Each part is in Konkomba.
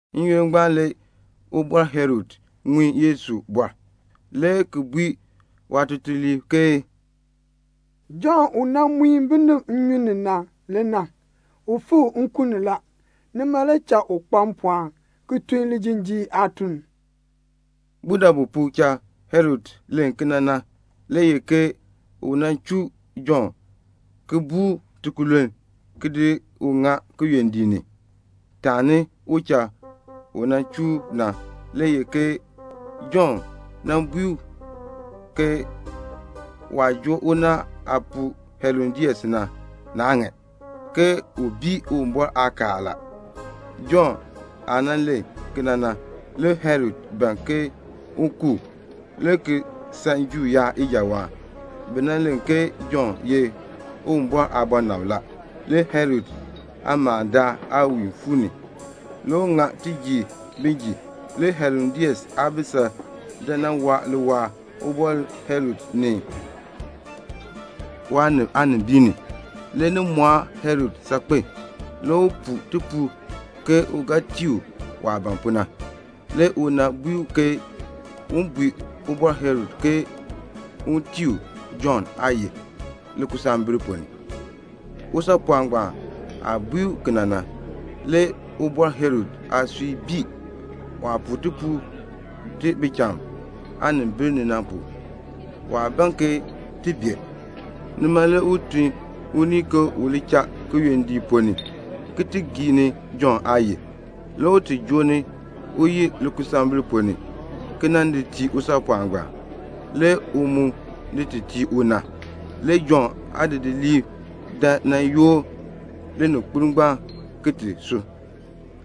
N-yoonn ngbaan le Ubɔr Herod ŋun Yesu aabɔr, le ki bui waatutuliib ke "Jɔnn u nan muin binib nnyun ni na le na. U fikr nkun ni la. Nima le cha u kpa mpɔɔn, ki tun lijinjiir aatun." Budabu pu cha Herod len kena na le ye ke u nan chuu Jɔnn ki buu u tikululn ki di ŋa kiyondiik ni. Taani u cha u chuu u na le ye ke Jɔnn bui u ke waah joo unaal aapuu Herodias na, naa ŋan, ke u bii Uwumbɔr aakaal la. Jɔnn aah len kena na, le Herod ban ke un ku u, le ki san Juu yaab ngbaan ijawaan. Bi len ke Jɔnn ye Uwumbɔr aabɔnabr la. Le Herod aamalndaal aawiin fuu ni. Le u ŋa tijiir bin jin. Le Herodias aabisal dan nan waa liwaal Ubɔr Herod ni waanib aanimbiin ni. Le ni mɔɔ Herod saakpen a. Le u puu tipuul ke u ga tii u waah ban pu na. Le una bui u ke un bui Ubɔr Herod ke un tii u Jɔnn aayil likusambil ponn ni. Usaapɔɔn ngbaan aah bui u kena na, le Ubɔr Herod aasui bii. Waah puu tipuul ti bicham aanimbil ni na, nima le waa ban ke ti bee. Nima le u tun unii ke u li cha kiyondiik ponn ni ki ti gii ni Jɔnn aayil. Le u yoor ni uyil likusambil ponn ni ki di tii usaapɔɔn ngbaan. Le u mu di ti tii una. Le Jɔnn aadidiliib dan nan yoor lininkpol ngbaan ki ti di sub,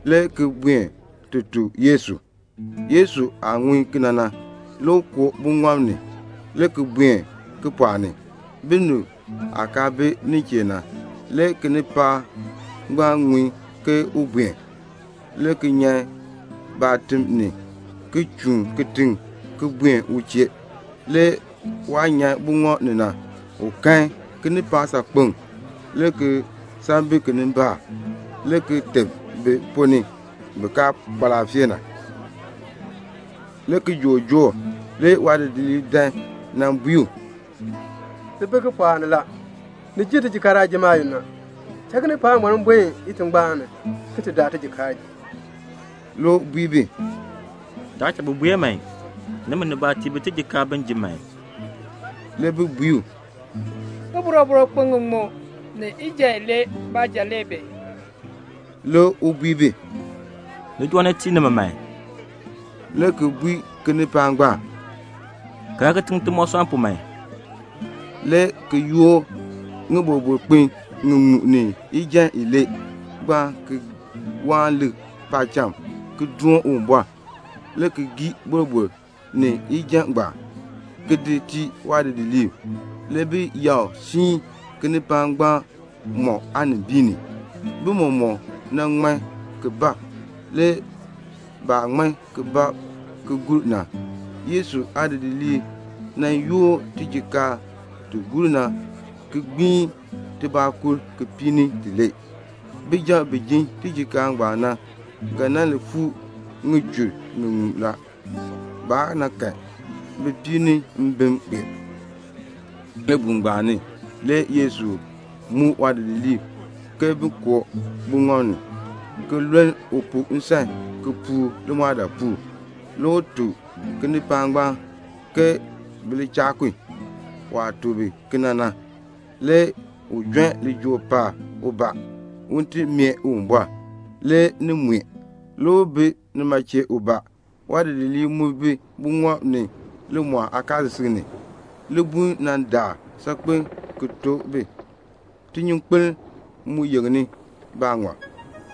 le ki buen ti tuk Yesu. Yesu aah ŋun kena na, le u koo buŋɔb ni, le ki buen kipɔɔk ni, binib aah kaa bi nin chee na. Le kinipaak ngbaan ŋun ke u buen, le ki nyan baatim ni, le ki chuun kitiŋ ki buen u chee. Le waah nyan buŋɔb ni na, le u kan kinipaak saakpeŋ, le ki san bi kinimbaak, le ki teb bi ponn ni bi kaa kpa laafee na. Le kijook joor. Le waadidiliib dan nan bui u, "Ti bi kipɔɔk ni la. Ni jer tijikaar aajim yoonn a. Tun kinipaak ngbaan bin buen itingbaan ni ki ti daa tijikaar ji." Le u bui bi, "Taa tun bi man. Nimi, tiin bi tijikaar man bin ji." Le bi bui u, "Ŋiboroboro kpin ŋiŋmu ni ijan ilee baanja le bi." Le u bui bi, "Li joo ni ki tii ni mi man," le ki bui kinipaak ngbaan, "Kaln kitiŋ timoosɔnn pu man," le ki yoor ŋiboroboro kpin ŋiŋmu ni ijan ilee ngbaan, le ki waan lik paacham, le ki doon Uwumbɔr, le ki gii boroboro ni ijan ngbaan, le ki di tii waadidiliib. Le bi yakr siin kinipaak ngbaan mɔk aanimbiin ni. Le bi mɔmɔk ŋman ki bab. Le baah ŋman ki bab ki gur na, le Yesu aadidiliib yoor tijikaar ti gur na ki gbiin tibɔɔkur kipiik ni tilee. Bijab bi jin tijikaar ngbaan na, ga nan li fuu ŋichur ŋiŋmu la. Baa kahn bipiib ni mbim kpee. Libuul ngbaan ni le Yesu muk waadidiliib ke bin koo buŋɔb ni ki luln u pu nsan ki puur limɔɔdaapuul. Le u tuk kinipaak ngbaan ke bi li cha kun. Waah tuk bi kena na, le u jon lijool paab ubaa, un ti mee Uwumbɔr. Le ni mue. Le u bi nima chee ubaa. Waadidiliib bi buŋɔb ni limɔɔl aakaasisik ni. Libuln mu daar saakpen ki tok bi, tinyunkpeln mu yeŋni baaŋɔb.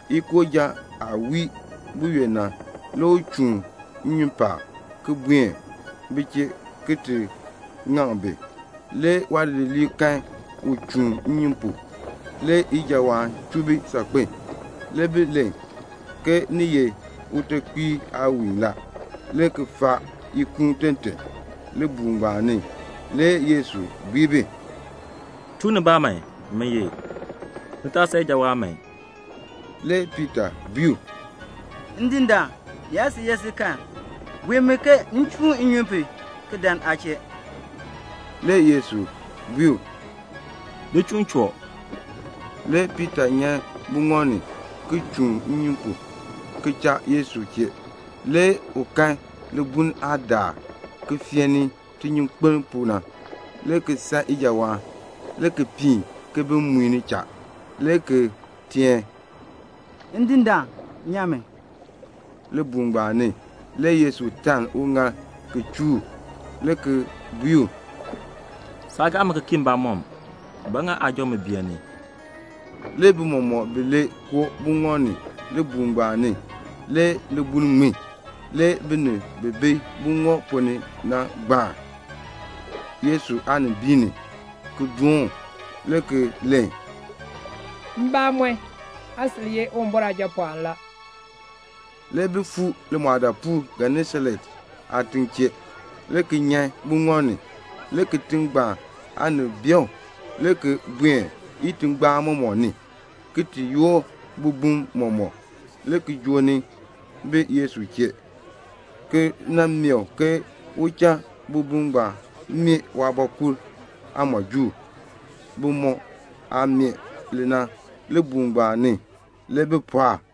Ikooja aah wii buyoonn na, le u chuun nnyun paab, ki buen bi chee, ki ŋaŋ bi. Le waadidiliib kan u chuun nnyun pu, le ki san ijawaan saakpen, le ki len ke ni ye utekpiir aawiin la, le ki faa ikuun tɔn tɔn. Libuul ngbaan ni le Yesu bui bi, "Chuu nibaa man. Min ye. Ni taa san ijawaan man." Le Piita bui u, "Ndindaan, ni yaa sil ye si kan, bui mi ke m chuun nnyun pu ki dan aa chee." Le Yesu bui u, "Li chuun choo." Le Piita nyan buŋɔb ni, le ki chuun nnyun pu ki cha Yesu chee. Le u kan libuln aah daar ki feeni tinyunkpeln pu na, le ki san ijawaan, le ki piin ki bi muini cha, le ki teen, "Ndindaan, nyan mi." Libuul ngbaan ni le Yesu taln uŋaal ki chuu u, le ki bui u, "Saa gaa mi ki kii mbamɔm. Ba ŋa aa beeni?" Le bi mɔmɔk bilee koo buŋɔb ni. Libuul ngbaan ni le libuln ŋmin. Le binib bi bi buŋɔb ponn ni na gbaan Yesu aanimbiin ni, le ki dooni u, le ki len, "Mbamɔn, aa sil ye Uwumbɔr Aajapɔɔn." Le bi fuu limɔɔdaapuul Genesaret aatiŋ chee, le ki nyan buŋɔb ni. Le kitiŋ ngbaan aanib bee u, le ki buen itingbaan mɔmɔk ni, le ki ti yoor bibum mɔmɔk, le ki joo ni bi Yesu chee, le ki mee u ke u cha bibum meeh waabɔkul aamɔjuul. Bimɔk aah meeh li na, libuul ngbaan ni le bi pɔɔk a.